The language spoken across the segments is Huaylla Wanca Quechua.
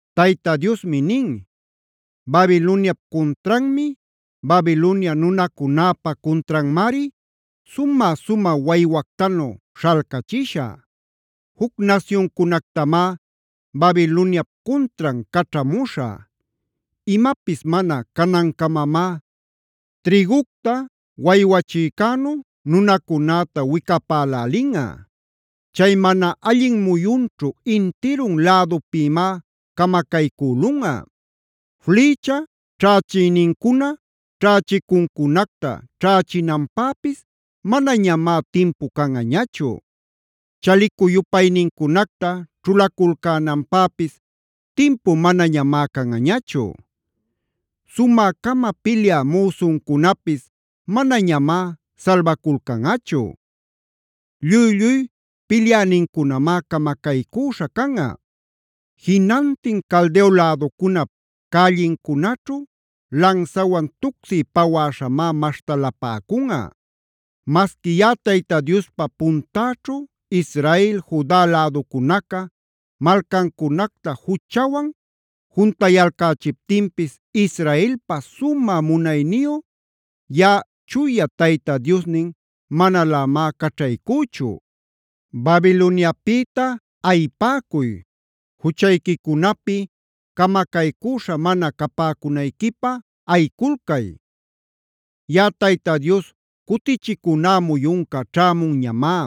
Tayta Diosmi nin: “Babiloniap cuntranmi, Babilonia nunacunäpa cuntranmari sumä-sumä waywactanu śhalcachishä. Juc nasyuncunactamá Babiloniap cuntran caćhamuśhä. Imapis mana canancamamá trïgucta waywachïcänu nunacunäta wicapälälinꞌa. Chay mana allin muyunćhu intirun lädupïmá camacaycülunꞌa. Flïcha ćhächïnincuna ćhächicuncunacta ćhächinanpäpis manañamá timpu canꞌañachu; chalicu-yupaynincunacta ćhulaculcänanpäpis timpu manamá canꞌañachu. Sumä-cama pilyä müsuncunapis manañamá salbaculcanꞌachu. Lluy-lluy pilyänincunamá camacaycüśha canꞌa. Jinantin Caldeo läducunap cällincunaćhu lansawan tucsiy pawäśhamá maśhtalapäcunꞌa. Masqui yaꞌa Tayta Diospa puntäćhu Israel, Juda läducunaca malcancunacta juchawan juntayalcächiptinpis Israelpa sumä munayniyu yaꞌa Chuya Tayta Diosnin manalämá caćhaycüchu. “¡Babiloniapïta ayipäcuy! ¡Juchayquicunapi camacaycüśha mana capäcunayquipä ayiculcay! Yaꞌa Tayta Dios cutichicuná muyunca ćhämunñamá;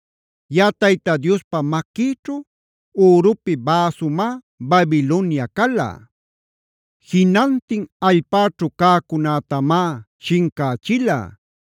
Yaꞌa Tayta Diospa maquïćhu ürupi bäsumá Babilonia cala. Jinantin allpäćhu cäcunätamá shincächila;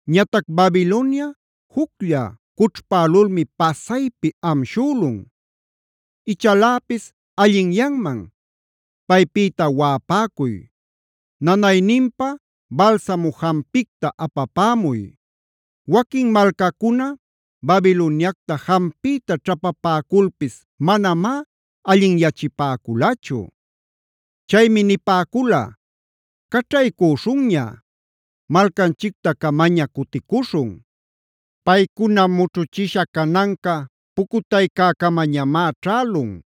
Ñatac Babilonia juclla cućhpälulmi pasaypi amshülun.c Ichaläpis allinyanman; paypïta waꞌapäcuy. Nanayninpä balsamu jampicta apapämuy. Waquin malcacuna Babiloniacta jampiyta ćhapapäculpis manamá allinyachipäculachu. Chaymi nipäcula: ‘Caćhaycüśhunña. Malcanchicta-camaña cuticuśhun. Paycuna mućhuchisha cananca pucutaycäcamañamá ćhälun,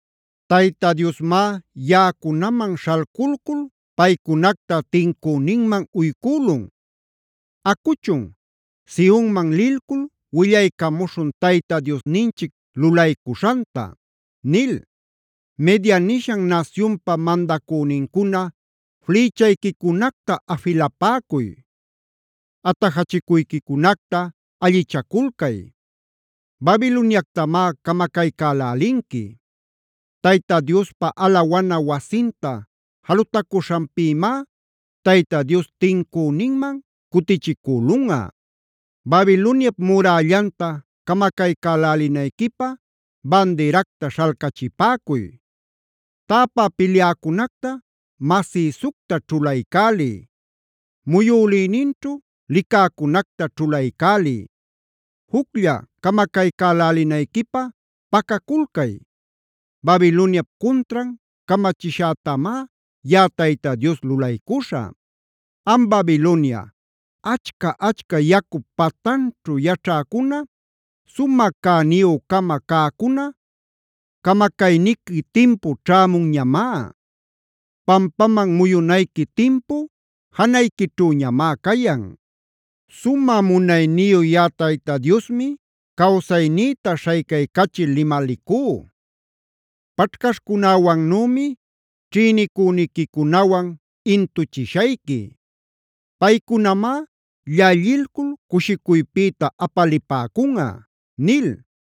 Tayta Diosmá yaꞌacunaman śhalculcul paycunacta tincüninman uycülun. Acuchun, Sionman lilcul willaycamuśhun Tayta Diosninchic lulaycuśhanta’ nil. “Media nishan nasyunpa mandacünincuna flïchayquicunacta afilapäcuy; atajachicuyquicunacta allichaculcay. Babiloniactamá camacaycälälinqui. Tayta Diospa alawana wasinta jalutacuśhanpïmá Tayta Dios tincüninman cutichicülunꞌa. Babiloniap murällanta camacaycälälinayquipä bandiracta śhalcachipäcuy. Täpä pilyäcunacta masïsucta ćhulaycäliy; muyülïninćhu licäcunacta ćhulaycäliy. Juclla camacaycälälinayquipä pacaculcay. Babiloniap cuntran camachishätamá yaꞌa Tayta Dios lulaycuśhä. Am Babilonia, achca-achca yacup patanćhu yaćhäcuna,e sumä cäniyü-cama cäcuna, camacayniqui timpu ćhämunñamá; pampaman muyunayqui timpu janayquićhüñamá cayan. Sumä munayniyu yaꞌa Tayta Diosmi cawsaynïta śhaycaycachil limalicú: Paćhcaśhcunäwannümi ćhïnicüniquicunawan intuchishayqui. Paycunamá llallilcul cushicuypïta apalipäcunꞌa” nil.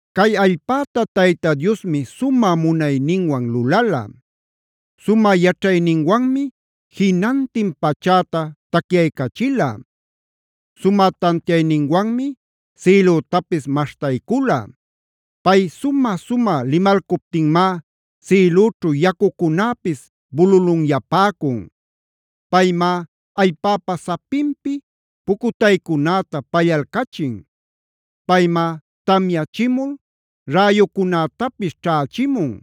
Cay allpäta Tayta Diosmi sumä munayninwan lulala. Sumä yaćhayninwanmi jinantin pachäta tacyaycachila. Sumä tantiayninwanmi sïlütapis maśhtaycula. Pay sumä-sumä limalcuptinmá sïlüćhu yacucunäpis bululunyapäcun; paymá allpäpa sapinpi pucutaycunäta pallalcachin. Paymá tamyachimul räyucunätapis ćhächimun.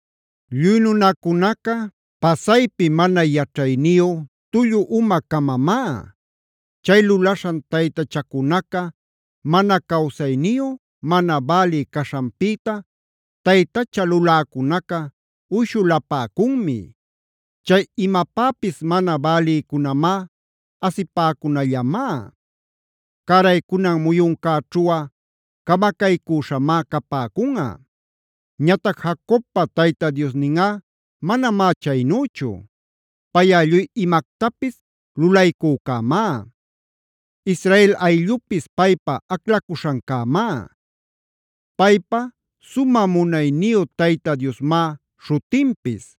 Lluy nunacunaca pasaypi mana yaćhayniyu, tullu uma-camamá. Chay lulaśhan taytachacunaca mana cawsayniyu, mana bälï caśhanpïta taytacha luläcunaca uyshulapäcunmi. Chay imapäpis mana bälïcunamá, asipäcunallamá. Cäraycunan muyuncäćhuꞌa camacaycüśhamá capäcunꞌa. Ñatac Jacobpa Tayta Diosninꞌa manamá chaynüchu. Payꞌa lluy imactapis Lulaycücämá. Israel ayllupis paypa aclacuśhancämá. Paypa “Sumä Munayniyu Tayta Diosmá” śhutinpis.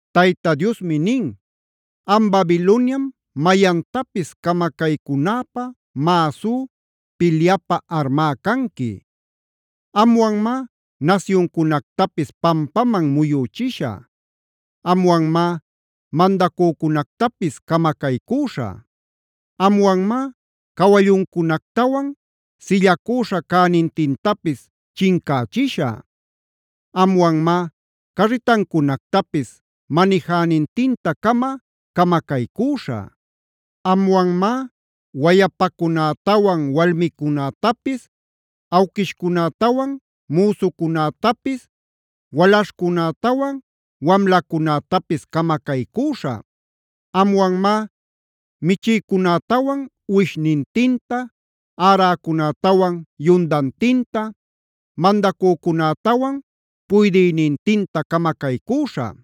Tayta Diosmi nin: “Am Babiloniam mayantapis camacaycunäpä mäsú,g pilyapä armá canqui. Amwanmá nasyuncunactapis pampaman muyüchishä; amwanmá mandacücunactapis camacaycüśhä. Amwanmá cawalluncunactawan sillacüśha cänintintapis chincächishä. Amwanmá carritacunactapis manijänintinta-cama camacaycüśhä. Amwanmá wayapacunätawan walmicunätapis, awquishcunätawan müsucunätapis, walaśhcunätawan wamlacunätapis camacaycüśhä. Amwanmá michïcunätawan uwishnintinta, äräcunätawan yundantinta, mandacücunätawan puydïnintinta camacaycüśhä.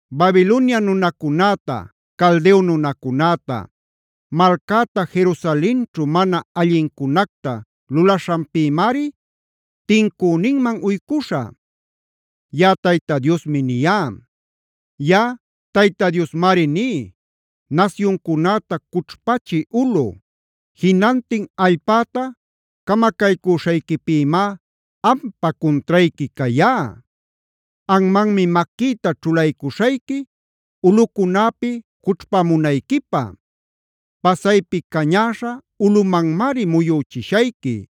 “Babilonia nunacunäta, Caldeo nunacunäta, malcäta Jerusalenćhu mana allincunacta lulaśhanpïmari tincüninman uycuśhä. Yaꞌa Tayta Diosmi niyá. Yaꞌa Tayta Diosmari ní: nasyuncunäta cućhpachï ulꞌu, jinantin allpäta camacaycüśhayquipïmá ampa cuntrayqui cayá. Anmanmi maquïta ćhulaycuśhayqui ulꞌucunäpi cućhpamunayquipä. Pasaypi cañäśha ulꞌumanmari muyüchishayqui.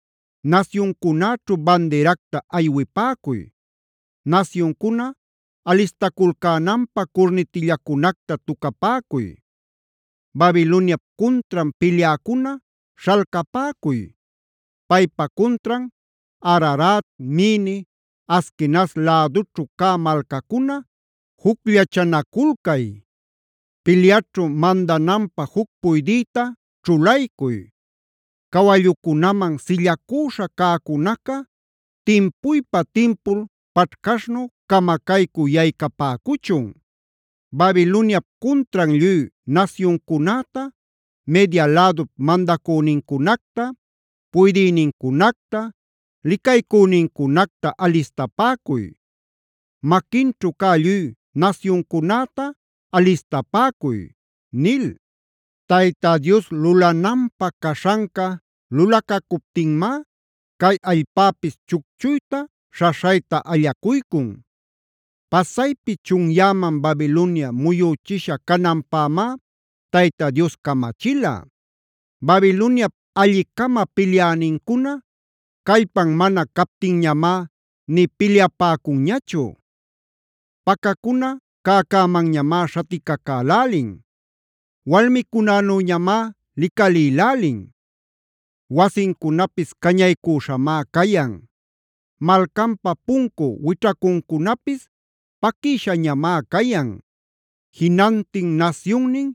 “Nasyuncunäćhu bandiracta aywipäcuy. Nasyuncuna alistaculcänanpä curnitillacunacta tucapäcuy. Babiloniap cuntran pilyäcuna śhalcapäcuy. Paypa cuntran Ararat, Mini, Askenaz lädućhu cä malcacuna jucllachanaculcay. Pilyaćhu mandananpä juc puydïta ćhulaycuy. Cawallucunaman sillacüśha cäcunaca timpuypa-timpul paćhcaśhnu camacaycü yaycapäcuchun. Babiloniap cuntran lluy nasyuncunäta, Media lädup mandacünincunacta, puydïnincunacta, licaycünincunacta alistapäcuy. Maquinćhu cä lluy nasyuncunäta alistapäcuy” nil. Tayta Dios lulananpä caśhanca lulacacuptinmá cay allpäpis chucchuyta, śhaśhayta allacuycun. Pasaypi chunyäman Babilonia muyüchisha cananpämá Tayta Dios camachila. Babiloniap alli-cama pilyänincuna callpan mana captinñamá nï pilyapäcunñachu; pacacuna cäcämanñamá śhaticacälälin; walmicunänüñamá licalïlälin. Wasincunapis cañaycüśhamá cayan; malcanpa puncu wićhacuncunapis paquïshañamá cayan. Jinantin nasyunnin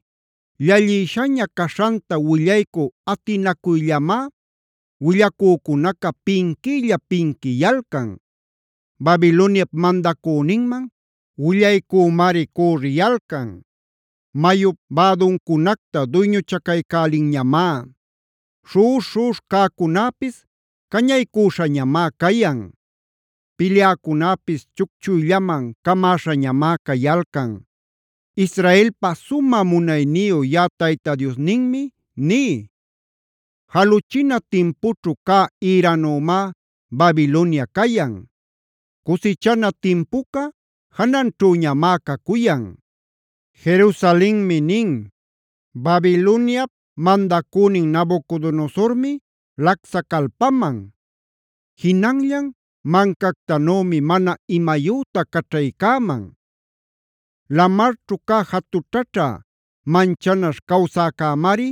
llallïshaña caśhanta willaycü atinacuyllamá willacücunaca pinquiylla-pinquiyalcan. Babiloniap mandacüninman willaycümari cürriyalcan. Mayup bäduncunacta duyñuchacaycälinñamá. Śhuꞌuśh-śhuꞌuśh cäcunäpis cañaycüśhañamá cayan. Pilyäcunäpis chucchuyllaman camäśhañamá cayalcan. “Israelpa sumä munayniyu yaꞌa Tayta Diosninmi ní: Jaluchina timpućhu cä ïränümá Babilonia cayan. Cusichana timpuca jananćhüñamá cacuyan. “Jerusalenmi nin: ‘Babiloniap mandacünin Nabucodonosormi lacsacalpaman; jinanllan mancactanümi mana imayüta caćhaycäman. Lamarćhu cä jatućhaćha manchanaśh cawsäcämari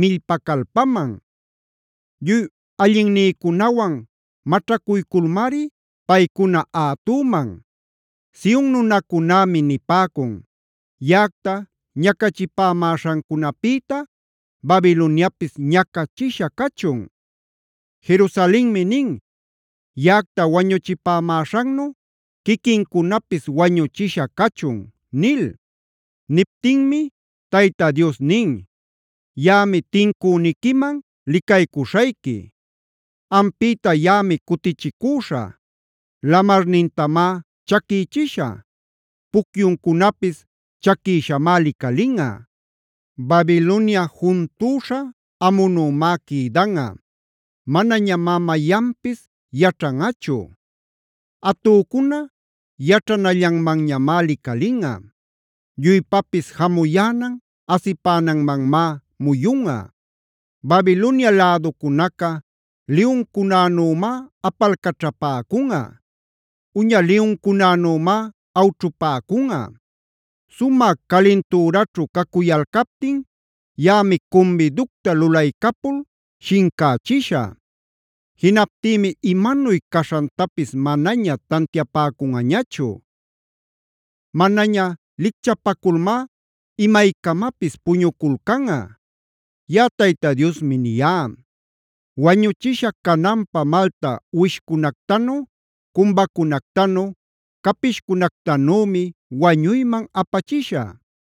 millpacalpaman. Lluy allinnïcunawan maćhacuyculmari paycuna ätüman. Sion nunacunämi nipäcun: Yaꞌacta ñacachipämäśhancunapïta Babiloniapis ñacachisha cachun. Jerusalenmi nin: Yaꞌacta wañuchipämäśhannu quiquincunapis wañuchisha cachun’” nil. Niptinmi Tayta Dios nin: “Yaꞌami tincüniquiman licaycuśhayqui; ampïta yaꞌami cutichicüśhä. Lamarnintamá chaquïchishä; pucyuncunapis chaquïshamá licalinꞌa. Babilonia juntüśha amunümá quïdanꞌa; manañamá mayanpis yaćhanꞌachu. Atücuna yaćhanallanmanñamá licalinꞌa. Lluypapis jamuyänan, asipänanmanmá muyunꞌa. Babilonia läducunaca liyuncunanümá apalcaćhapäcunꞌa. Uña liyuncunanümá awćhupäcunꞌa. Sumä calintüraćhu cacuyalcaptin yaꞌami cumbiducta lulaycapul shincächishä. Jinaptïmi imanuy caśhantapis manaña tantiapäcunꞌañachu. Manaña lichcapaculmá imaycamapis puñuculcanꞌa. Yaꞌa Tayta Diosmi niyá. Wañuchisha cananpä malta uwishcunactanu, cumbacunactanu, capishcunactanümi wañuyman apachishä.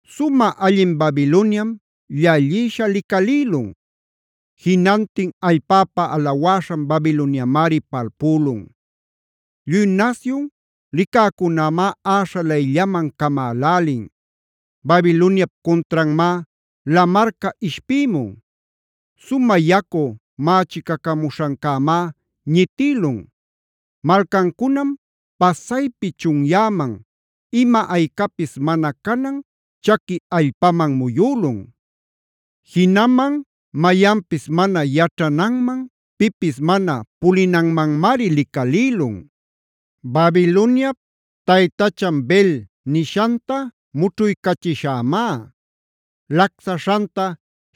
“Sumä allin Babiloniam llallïsha licalïlun. Jinantin allpäpa alawäśhan Babiloniamari palpülun. Lluy nasyun licäcunämá äśhalayllaman camälälin. Babiloniap cuntranmá lamarca ishpïmun; sumä yacu mächicacamuśhancämá ñitïlun. Malcancunam pasaypi chunyäman, ima-aycapis mana canan chaqui allpaman muyülun; jinaman mayanpis mana yaćhananman, pipis mana pulinanmanmari licalïlun. “Babiloniap taytachan Bel nishanta mućhuycachishämá. Lacsaśhanta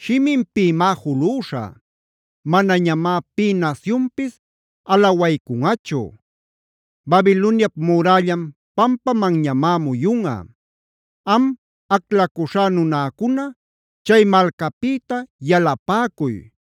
shiminpïmá julüśhä. Manañamá pï nasyunpis alawaycunꞌachu. Babiloniap murällan pampamanñamá muyunꞌa. “Am, aclacuśhá nunäcuna chay malcapïta yalapäcuy.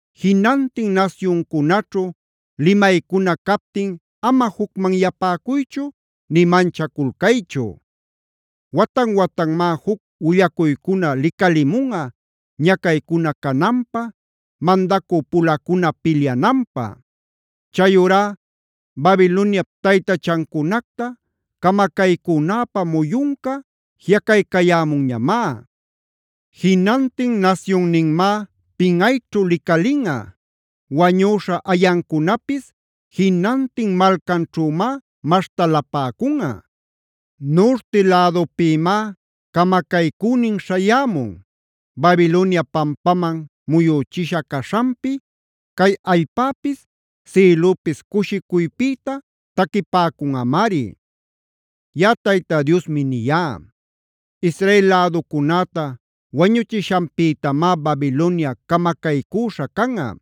Jinantin nasyuncunaćhu limaycuna captin ama jucmanyapäcuychu nï manchaculcaychu. Watan-watanmá juc willacuycuna licalimunꞌa, ñacaycuna cananpä, mandacü-pulacuna pilyananpä. Chayurá Babiloniap taytachancunacta camacaycünäpä muyunca jiꞌacaycayämunñamá. Jinantin nasyunninmá pinꞌayćhu licalinꞌa; wañüśha ayancunapis jinantin malcanćhümá maśhtalapäcunꞌa. Nurti lädupïmá camacaycünin śhayämun. Babilonia pampaman muyüchisha caśhanpi cay allpäpis sïlüpis cushicuypïta taquipäcunꞌamari.i Yaꞌa Tayta Diosmi niyá. Israel läducunäta wañuchishanpïtamá Babilonia camacaycüśha canꞌa.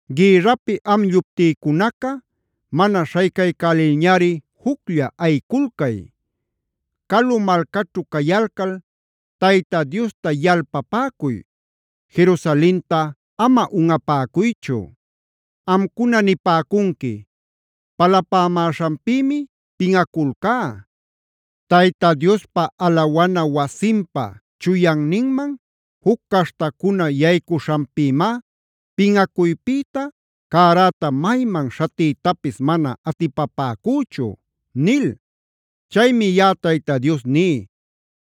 “Gïrrapi am lluptïcunaca mana śhaycaycälilñari juclla ayiculcay. Calu malcaćhu cayalcal Tayta Diosta yalpapäcuy; Jerusalenta ama unꞌapäcuychu. Amcuna nipäcunqui: ‘Palapämäśhanpïmi pinꞌaculcá. Tayta Diospa alawana wasinpa chuyanninman juc caśhtacuna yaycuśhanpïmá pinꞌacuypïta cäräta mayman śhatiytapis mana atipapäcüchu’ nil. “Chaymi yaꞌa Tayta Dios ní: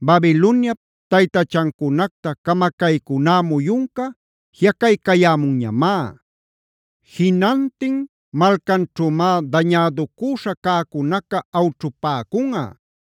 Babiloniap taytachancunacta camacaycuná muyunca jiꞌacaycayämunñamá. Jinantin malcanćhümá dañäducüśha cäcunaca awćhupäcunꞌa.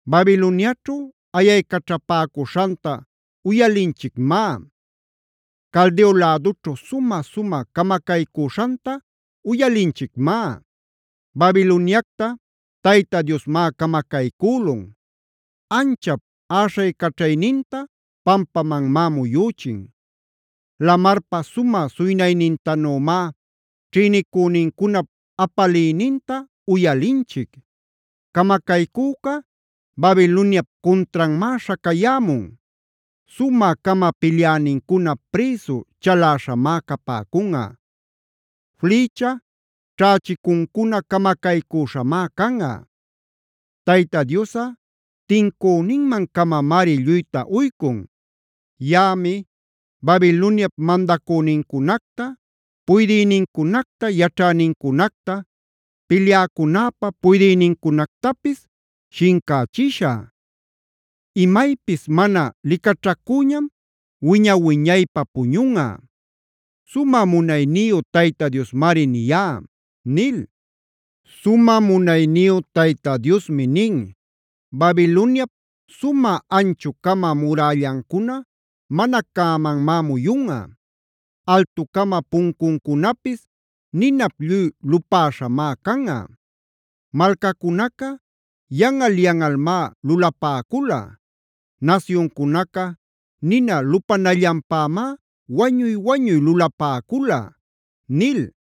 “Babiloniaćhu ayaycaćhapäcuśhanta uyalinchicmá. Caldeo lädućhu sumä-sumä camacaycüśhanta uyalinchicmá. Babiloniacta Tayta Diosmá camacaycülun; anchap äśhaycaćhayninta pampamanmá muyüchin. Lamarpa sumä suynaynintanümá ćhïnicünincunap apaliyninta uyalinchic. Camacaycüca Babiloniap cuntranmá śhacayämun. Sumä-cama pilyänincuna prïsu chaläśhamá capäcunꞌa; flïcha ćhächicuncuna camacaycüśhamá canꞌa. Tayta Diosꞌa tincüninman-camamari lluyta uycun. Yaꞌami Babiloniap mandacünincunacta, puydïnincunacta, yaćhänincunacta, pilyäcunäpa puydïnincunactapis shincächishä. Imaypis mana licaćhacüñam wiña-wiñaypä puñunꞌa. Sumä munayniyu Tayta Diosmari niyá” nil. Sumä munayniyu Tayta Diosmi nin: “Babiloniap sumä anchu-cama murällancuna mana cämanmá muyunꞌa. Altu-cama puncuncunapis ninap lluy lupäśhamá canꞌa. Malcacunaca yanꞌal-yanꞌalmá lulapäcula; nasyuncunaca nina lupanallanpämá wañuy-wañuy lulapäcula” nil.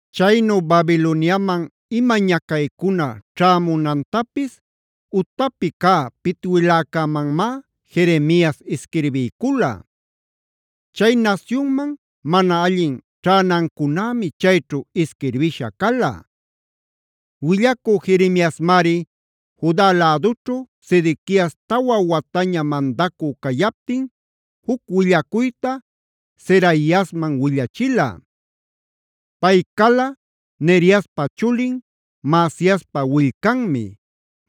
Chaynu Babiloniaman ima ñacaycuna ćhämunantapis utapi cä pitwiläcämanmá Jeremias isquirbiycula. Chay nasyunman mana allin ćhänancunämi chayćhu isquirbisha cala. Willacü Jeremiasmari Juda lädućhu Sedequias tawa wataña mandacü cayaptin juc willacuyta Seraiasman willachila. (Pay cala Neriaspa chulin, Maasiaspa willcanmi.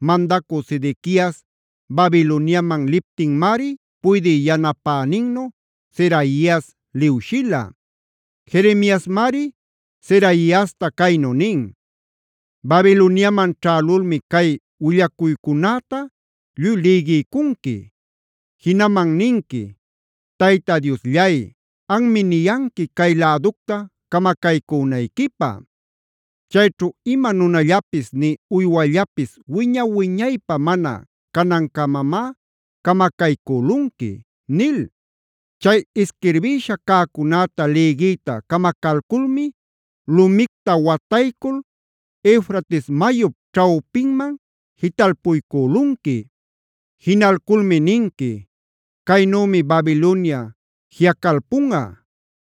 Mandacü Sedequias Babiloniaman liptinmari puydï yanapäninnu Seraias liwshila). Jeremiasmari Seraiasta caynu nin: “Babiloniaman ćhälulmi cay willacuycünäta lluy lïgiycunqui. Jinaman ninqui: ‘Tayta Diosllay, anmi niyanqui, cay läducta camacaycünayquipä. Chayćhu ima nunallapis nï uywallapis wiña-wiñaypä mana canancamamá camacaycülunqui’ nil. Chay isquirbïsha cäcunäta lïgiyta camacalculmi lumicta wataycul Eufrates mayup ćhawpinman jitalpuycülunqui. Jinalculmi ninqui: ‘Caynümi Babilonia jiꞌacalpunꞌa.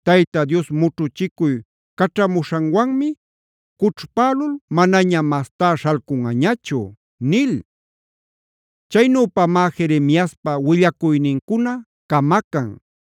Tayta Dios mućhuchicuy caćhamuśhanwanmi cućhpälul manaña mastá śhalcunꞌañachu’” nil.k Chaynüpamá Jeremiaspa willacuynincuna camacan.